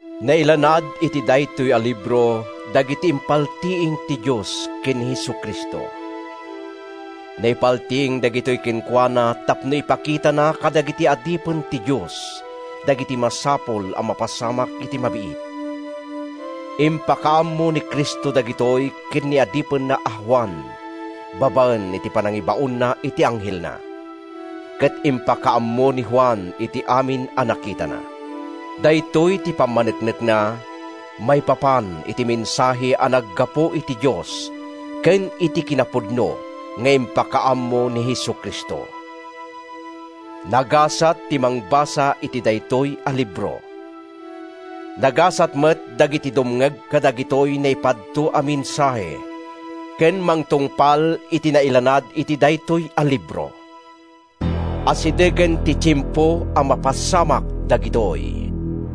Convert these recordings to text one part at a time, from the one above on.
Nailanad iti daytoy a libro dagiti impaltiing ti Dios ken ni Jesu-Cristo. Naipaltiing dagitoy kenkuana tapno ipakitana kadagiti adipen ti Dios dagiti masapul a mapasamak iti mabiit. Impakaammo ni Cristo dagitoy ken ni adipenna a Juan babaen iti panangibaonna iti anghelna, ket impakaammo ni Juan ti amin a nakitana. Daytoy ti pammaneknekna maipapan iti mensahe a naggapu iti Dios ken iti kinapudno nga impakaammo ni Jesu-Cristo. Nagasat ti mangbasa iti daytoy a libro. Nagasat met dagiti dumngeg kadagitoy naipadto a mensahe ken mangtungpal iti nailanad iti daytoy a libro! Asidegen ti tiempo a mapasamak dagitoy.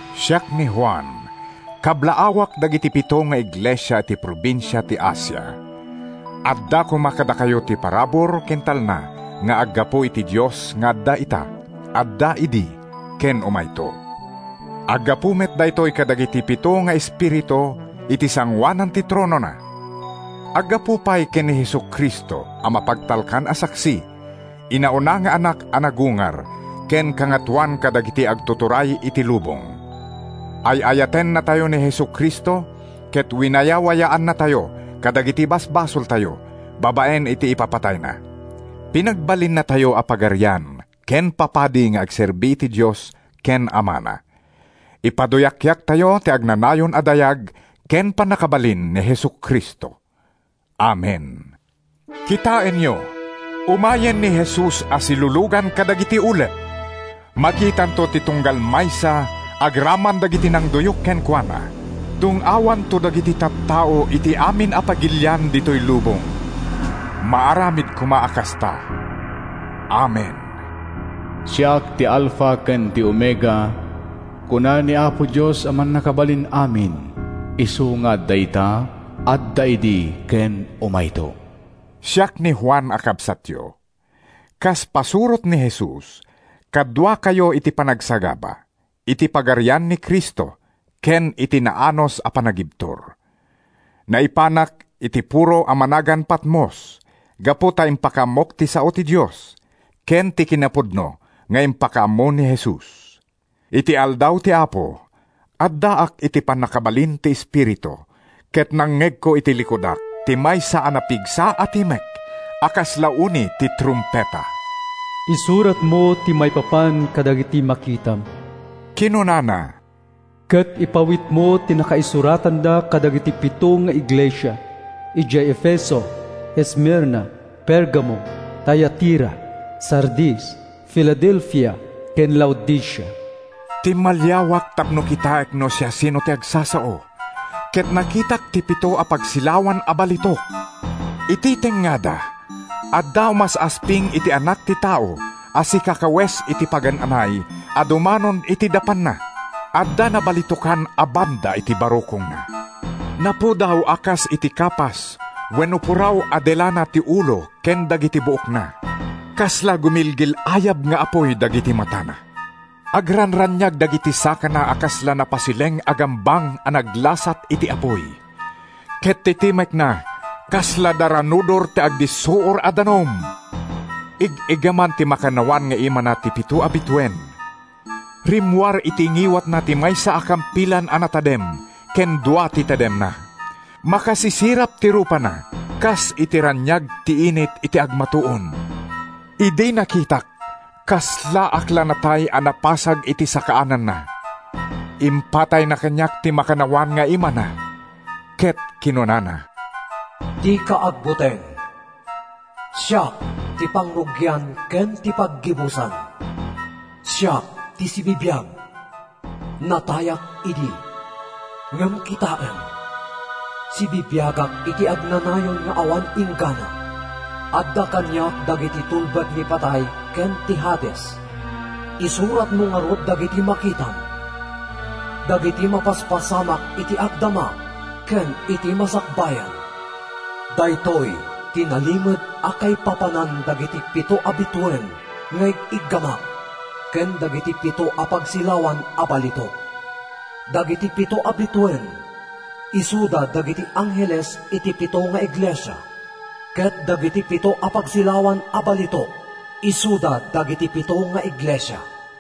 Siak, ni Juan: Kablaawak dagiti pito nga iglesia iti probinsia ti Asia. Adda koma kadakayo ti parabur ken talna nga aggapu iti Dios nga adda ita, adda idi ken umayto. Aggapu met daytoy kadagiti pito nga espiritu iti sangoanan ti tronona. Aggapu pay ken ni Jesu-Cristo a mapagtalkan a saksi, inauna nga Anak a nagungar ken kangatoan kadagiti agtuturay iti lubong. Ay-ayatennatayo ni Jesu-Cristo, ket winayawayaannatayo kadagiti basbasoltayo babaen iti ipapatayna. Pinagbalinnatayo a pagarian, ken papadi nga agserbi iti Dios ken Amana. Ipaduyakyaktayo ti agnanayon a dayag ken pannakabalin ni Jesu-Cristo! Amen. Kitaenyo, umayen ni Jesus a silulugan kadagiti ulep! Makitanto ti tunggal maysa, agraman dagiti nangduyok kenkuana. Dung-awanto dagiti tattao iti amin a pagilian ditoy lubong. Maaramid koma a kasta! Amen. “Siak ti Alfa ken ti Omega,” kuna ni Apo Dios a Mannakabalin-amin, isu nga adda ita, adda idi ken umayto. Siak ni Juan a kabsatyo. Kas pasurot ni Jesus, kaduakayo iti panagsagaba, iti pagarian ni Cristo ken iti naanus a panagibtur. Naipanak iti puro a managan Patmos gapu ta impakaammok ti sao ti Dios ken ti kinapudno nga impakaammo ni Jesus. Iti aldaw ti Apo, addaak iti pannakabalin ti Espiritu ket nangngegko iti likudak ti maysa a napigsa a timek a kasla uni ti trumpeta. “Isuratmo ti maipapan kadagiti makitam,” kinunana, “ket ipaw-itmo ti nakaisuratanda kadagiti pito nga iglesia: idiay Efeso, Esmirna, Pergamo, Tiatira, Sardis, Filadelfia ken Laodicea.” Timmaliawak tapno kitaek no siasino ti agsasao, ket nakitak ti pito a pagsilawan a balitok. Iti tengngada, adda umas-asping iti anak ti tao a sikakawes iti pagan-anay a dumanon iti dapanna. Adda nabalitokan a banda iti barukongna. Napudaw a kas iti kapas wenno puraw a delana ti ulo ken dagiti buokna. Kasla gumilgil-ayab nga apuy dagiti matana. Agranraniag dagiti sakana a kasla napasileng a gambang a naglasat iti apuy. Ket ti timekna kasla daranudor ti agdissuor a danum. Ig-iggaman ti makannawan nga imana ti pito a bituen. Rimmuar iti ngiwatna ti maysa a kampilan a natadem ken dua ti tademna. Makasisirap ti rupana kas iti raniag ti init iti agmatuon. Idi nakitak, kaslaak la natay a napasag iti sakaananna. Impatayna kaniak ti makannawan nga imana ket kinunana: “Dika agbuteng! Siak ti Pangrugian ken ti Paggibusan. Siak ti sibibiag! Natayak idi, ngem kitaem, sibibiagak iti agnanayon nga awan inggana. Adda kaniak dagiti tulbek ni Patay ken ti Hades. Isuratmo ngarud dagiti makitam, dagiti mapaspasamak iti agdama ken iti masakbayan. “Daytoy ti nalimed a kaipapanan dagiti pito a bituen nga ig-iggamak ken dagiti pito a pagsilawan a balitok: Dagiti pito a bituen isuda dagiti angheles iti pito nga iglesia, ket dagiti pito a pagsilawan a balitok isuda dagiti pito nga iglesia.”